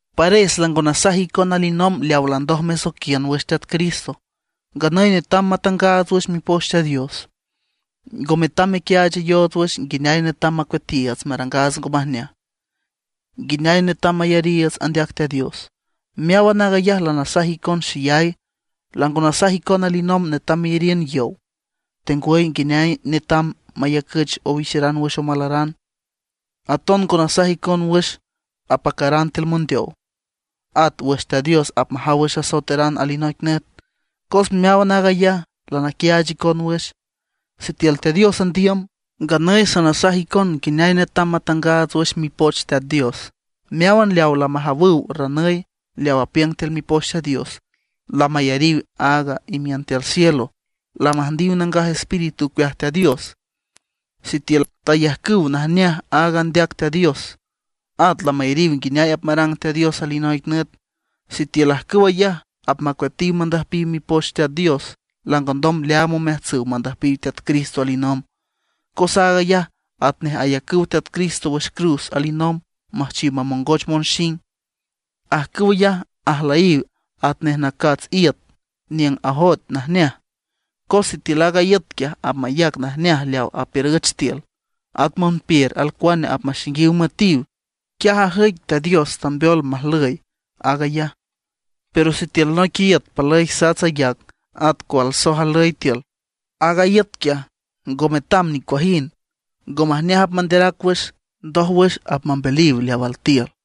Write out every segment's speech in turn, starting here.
Pares lango nasaj icon alinomb leaw landoj mesoiquiün wüx Teat Cristo. Nganüy netam matangaats wüx Mipoch Teat Dios; ngo metam mequiaachayoots wüx nguineay netam macueatiiüts marangaats ngo majneaj, nguineay netam mayariiüts andeac Teat Dios. Meáwan aag ayaj lanasaj icon xeyay. Lango nasaj icon alinomb netam meyariün yow, tengwüy nguineay netam mayacüch owixeran wüx omalaran. Aton ngo nasaj icon wüx apacaran tiül mondeow, at wüx Teat Dios apmajaw wüx asoeteran alinoic nüt. Cos meáwan aag ayaj lanaquiaach icon wüx. Sitiül Teat Dios andiüm, nganüy sanasaj icon nguineay netam matangaats wüx Mipoch Teat Dios. Meáwan leawa lamajawüw ranüy leaw apiüng tiül Mipoch Teat Dios, lamayariw aag imiün tiül cielo, lamüjndiw Nangaj Espíritu ocueaj Teat Dios, sitiül tayajcüw najneaj aaga andeac Teat Dios, at lamayariw nguineay apmarang Teat Dios alinoic nüt; sitiül ajcüw ayaj apmacueatiw mandüjpiw Mipoch Teat Dios, lango ndom leaam omeajtsüw mandüjpiw Teat Cristo alinomb, cos aag ayaj atnej ayacüw Teat Cristo wüx cruz alinomb müjchiw mamongoch monxing. Ajcüw ayaj ajlüyiw atnej nacats iüt niüng ajoet najneaj, cos sitiül aag iüt quiaj apmayac najneaj leaw apiürüch tiül, at monpiür alcuane apmaxaingiw müetiw, quiaj ajüic Teat Dios tambeol majlüy aag ayaj. Pero sitiül noic iüt palüy sats ayac, at cualsoj ajlüy tiül, aaga iüt ngo metam nicuajind, ngo majneaj apmanderac wüx. Ndójwüx apmambeliw leaw altiül.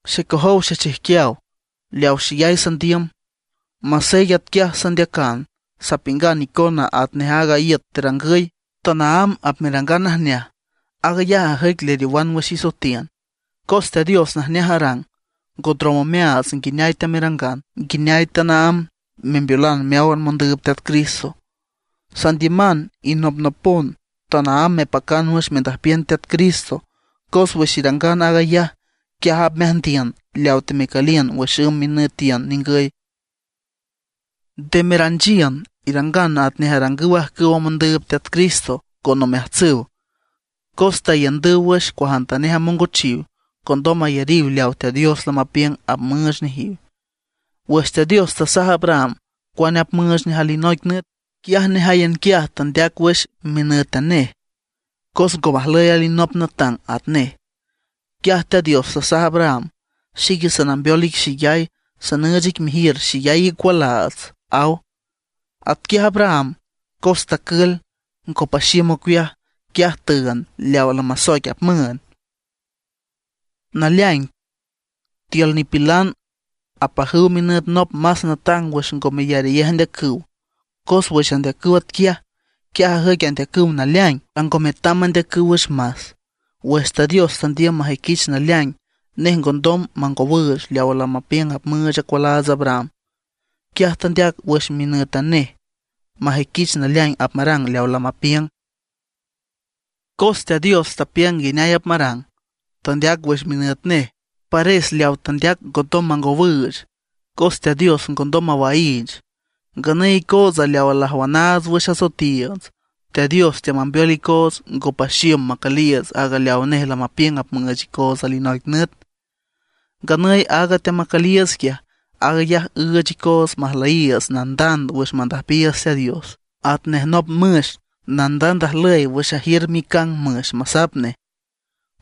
Xecojow xechijquiaw leaw xeyay sandiüm, masey atquiaj sandeacan, sapiüngan icona atnej aaga iüt terangüy, tanaámb apmerangan najneaj; aag ayaj ajüic leriowan wüx isoetiün. Cos Teat Dios najneaj arang, ngo ndrom omeaats nguineay teamerangan, nguineay tanaámb membeolan meáwan mondüüb Teat Cristo. Sandiüman inopnopon tanaámb mepacan wüx mendüjpiün Teat Cristo, cos wüx irangan aag ayaj, quiaj apmeajndiün leawa temecüliün wüx ümb minütiün ningüy. Nde meranchiün; irangan atnej arangüw ajcüwa mondüüb Teat Cristo con omeajtsüw, cos taiündüw wüx cuajantanej amongochiw, condom ayariw leaw Teat Dios lamapiüng apmüüch nejiw. Wüx Teat Dios tasaj Abraham cuane apmüüch nej alinoic nüt, quiaj nejáyan quiaj tandeac wüx minǘtan nej, cos ngo majlüy alinop natang atnej. Quiaj Teat Dios tasaj Abraham: “Xique sanambeol ic xeyay, sanüüch ic mejiür xeyay icualaats”, aw. Atquiaj Abraham, cos tacül, ngo paxiüm ocueaj, quiaj tüünd leawa lamasoic apmüünd. Naleaing, tiül nipilan apajüw minüt nop más natang wüx ngo meyarayej andeacüw. Cos wüx andeacüw atquiaj, quiaj ajüic andeacüw naleaing, lango metam mandeacüw wüx más. Wüx Teat Dios tandiüm majüiquich naleaing, nej ngondom mangowüüch leawa lamapiüng apmüüch acualaats Abraham, quiaj tandeac wüx minǘtan nej majüiquich naleaing apmarang leaw lamapiüng. Cos Teat Dios tapiüng nguineay apmarang, tandeac wüx minüt nej, pares leaw tandeac ngondom mangowüüch, cos Teat Dios ngondom mawaiich. Nganüy icootsa leawa lajwanaats wüx asoetiiüts, Teat Dios teamambeol icoots ngo paxiüm macüliiüts aaga leaw nej lamapiüng apmüüch icoots alinoic nüt. Nganüy aaga teamacüliiüts quiaj, aag ayaj üüch icoots majlüyiiüts nandand wüx mandüjpiiüts Teat Dios, atnej nop müx nandand ajlüy wüx ajiür micang müx masap nej.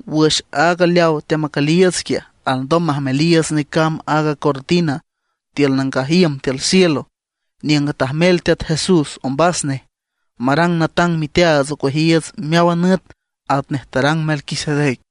Wüx aaga leawa teamacüliiüts quiaj, alndom majmeliiüts necamb aaga cortina tiül nangaj iüm tiül cielo; niüng tajmel Teat Jesús, ombas nej, marang natang miteaats ocueajiiüts meáwan nüt atnej tarang Melquisedec.